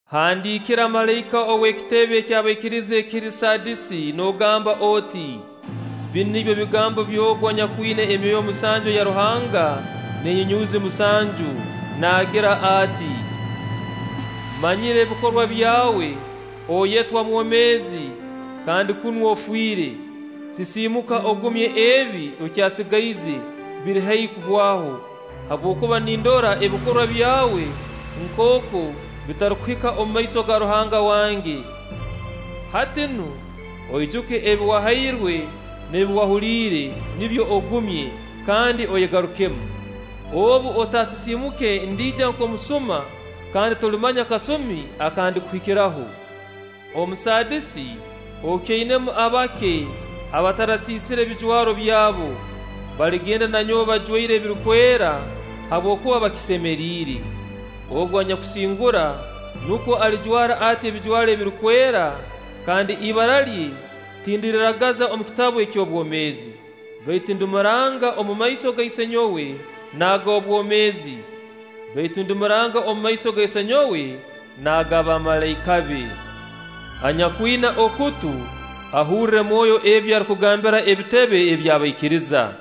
“Handiikira malaika ow'ekitebe eky'abaikiriza ekiri Saadisi noogamba oti: Binu nibyo bigambo by'Ogu anyakwina emyoyo musanju eya Ruhanga n'enyunyuuzi musanju. Naagira ati: “Mmanyire ebikorwa byawe, oyetwa mwomeezi kandi kunu ofiire! Sisiimuka, ogumye ebi okyasigaize, biri haihi kuhwaho; habwokuba nindora ebikorwa byawe nkooku bitarukuhika omu maiso ga Ruhanga wange. Hati nu oijuke ebi wahairwe n'ebi wahuliire; nibyo ogumye, kandi oyegarukemu. Obu otasisiimuke ndiija nk'omusuma, kandi tolimanya kasumi aka ndikuhikiraho. Omu Saadisi okyainamu abake abatarasiisire bijwaro byabo. Baligenda na nyowe bajwaire ebirukwera, habwokuba bakisemeriire. Ogu anyakusingura, nukwo alijwara ati ebijwaro ebirukwera, kandi ibara lye tindiriragaza omu kitabu eky'obwomeezi; baitu ndimuranga omumaiso ga Isenyowe n'ag'obwomeezi; baitu ndimuranga omumaiso ga Isenyowe n'ag'abamalaika be. Anyakwina okutu, ahurre Mwoyo ebi arukugambira ebitebe eby'abaikiriza.”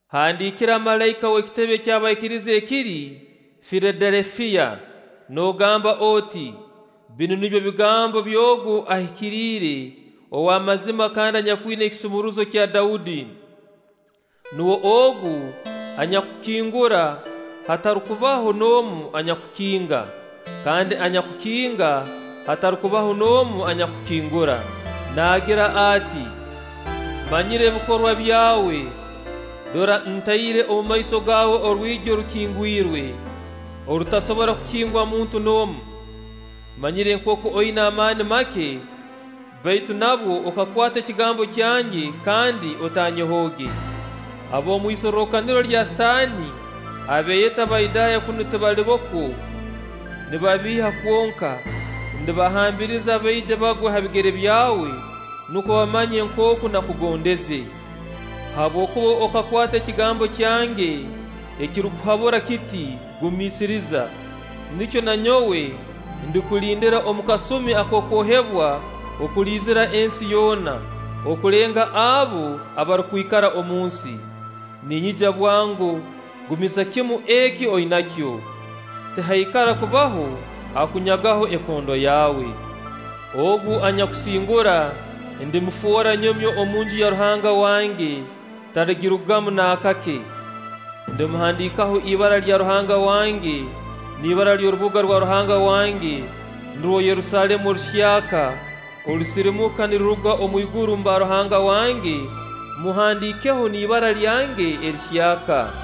“Handiikira malaika ow'ekitebe eky'abaikiriza ekiri Filadelufiya noogamba oti: Binu nibyo bigambo by'Ogu Ahikiriire, ow'amazima kandi anyakwina ekisumuruzo kya Daudi. Nuwe ogu anyakukingura hatarukubaho n'omu anyakukinga; kandi anyakukinga hatarukubaho n'omu anyakukingura. Naagira ati: “Mmanyire ebikorwa byawe. Dora ntaire omu maiso gaawe orwigi orukingwirwe, orutasobora kukingwa muntu n'omu. mmanyire nkooku oina amaani make, baitu nabwo okakwata ekigambo kyange kandi otanyehooge. Ab'omu isorrokaniro lya Sitaani, abeeyeta Bayudaaya kunu tibalibo kwo, nibabiiha kwonka--ndabahambiriza baije bagwe ha bigere byawe, nukwo bamanye nkooku nakugondeze. Habwokuba okakwata ekigambo kyange ekirukuhabura kiti: Gumiisiriza; nikyo na nyowe ndikulindira omu kasumi ak'okwohebwa okuliizira ensi yoona, okulenga abo abarukwikara omunsi. Ninyija bwango; gumiza kimu eki oinakyo, tihaikara kubaho akunyagaho ekondo yawe. Ogu anyakusingura, ndimufoora nyomyo omunju ya Ruhanga wange, taligirugamu naakake. Ndimuhandiikaho ibara lya Ruhanga wange n'ibara ly'orubuga rwa Ruhanga wange nurwo Yerusaalemu oruhyaka orusirimuka niruruga omw'iguru mba Ruhanga wange Mmuhandiikeho n'ibara lyange erihyaka.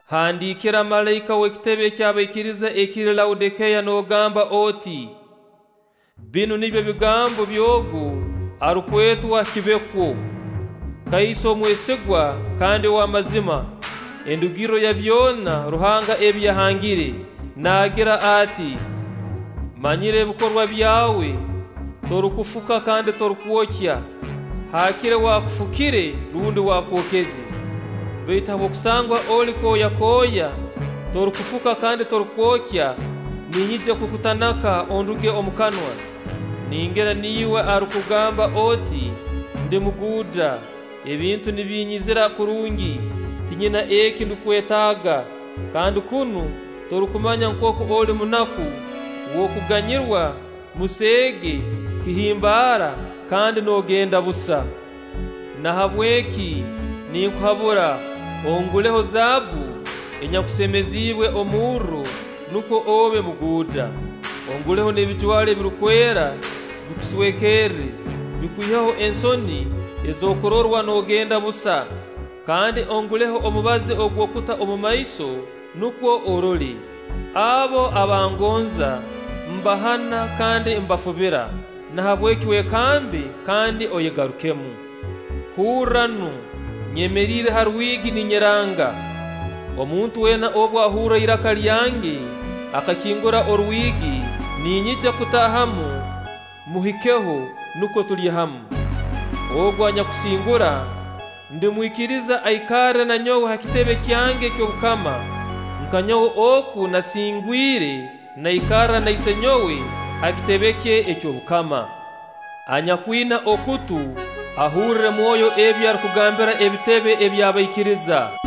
“Handiikira malaika ow'ekitebe eky'abaikiriza ekiri Laodikeya noogamba oti: ‘Binu nibyo bigambo by'Ogu arukwetwa “Kibekwo”, kaiso omwesigwa kandi ow'amazima, endugirro ya byona Ruhanga ebi yahangire. Naagira ati: “‘Mmanyire ebikorwa byawe: torukufuka kandi torukwokya. Haakire waakufukire rundi waakwokeze! Baitu habw'okusangwa oli kooyakooya, torukufuka kandi torukwokya, ninyija kukutanaka, onduge omu kanwa! Ningira niiwe arukugamba oti: Ndi muguuda, ebintu nibinyizira kurungi, tinyina eki ndukwetaaga; kandi kunu torukumanya nkooku oli munaku, w'okuganyirwa, museege, kihimbaara, kandi noogenda busa. Nahabweki ninkuhabura: onguleho zaabbu enyakusemeziibwe omurro, nukwo obe muguuda. Onguleho n'ebijwaro ebirukwera, bikuswekerre, bikwiheho ensoni ez'okurorwa noogenda busa; kandi onguleho omubazi ogw'okuta omumaiso, nukwo orole. Abo aba ngonza, mbahana kandi mbafubira; nahabweki wekambe kandi oyegarukemu. Hurra nu, nyemeriire ha rwigi ninyeranga; omuntu weena obu ahurra iraka lyange akakingura orwigi, ninyija kutaahamu, mmuhikeho, nukwo tulye hamu. Ogu anyakusingura, ndimwikiriza aikarre na nyowe ha kitebe kyange eky'obukama, nka nyowe oku nasingwire, naikarra na Isenyowe ha kitebe kye eky'obukama. Anyakwina okutu, ahurre Mwoyo ebi arukugambira ebitebe eby'abaikiriza.’”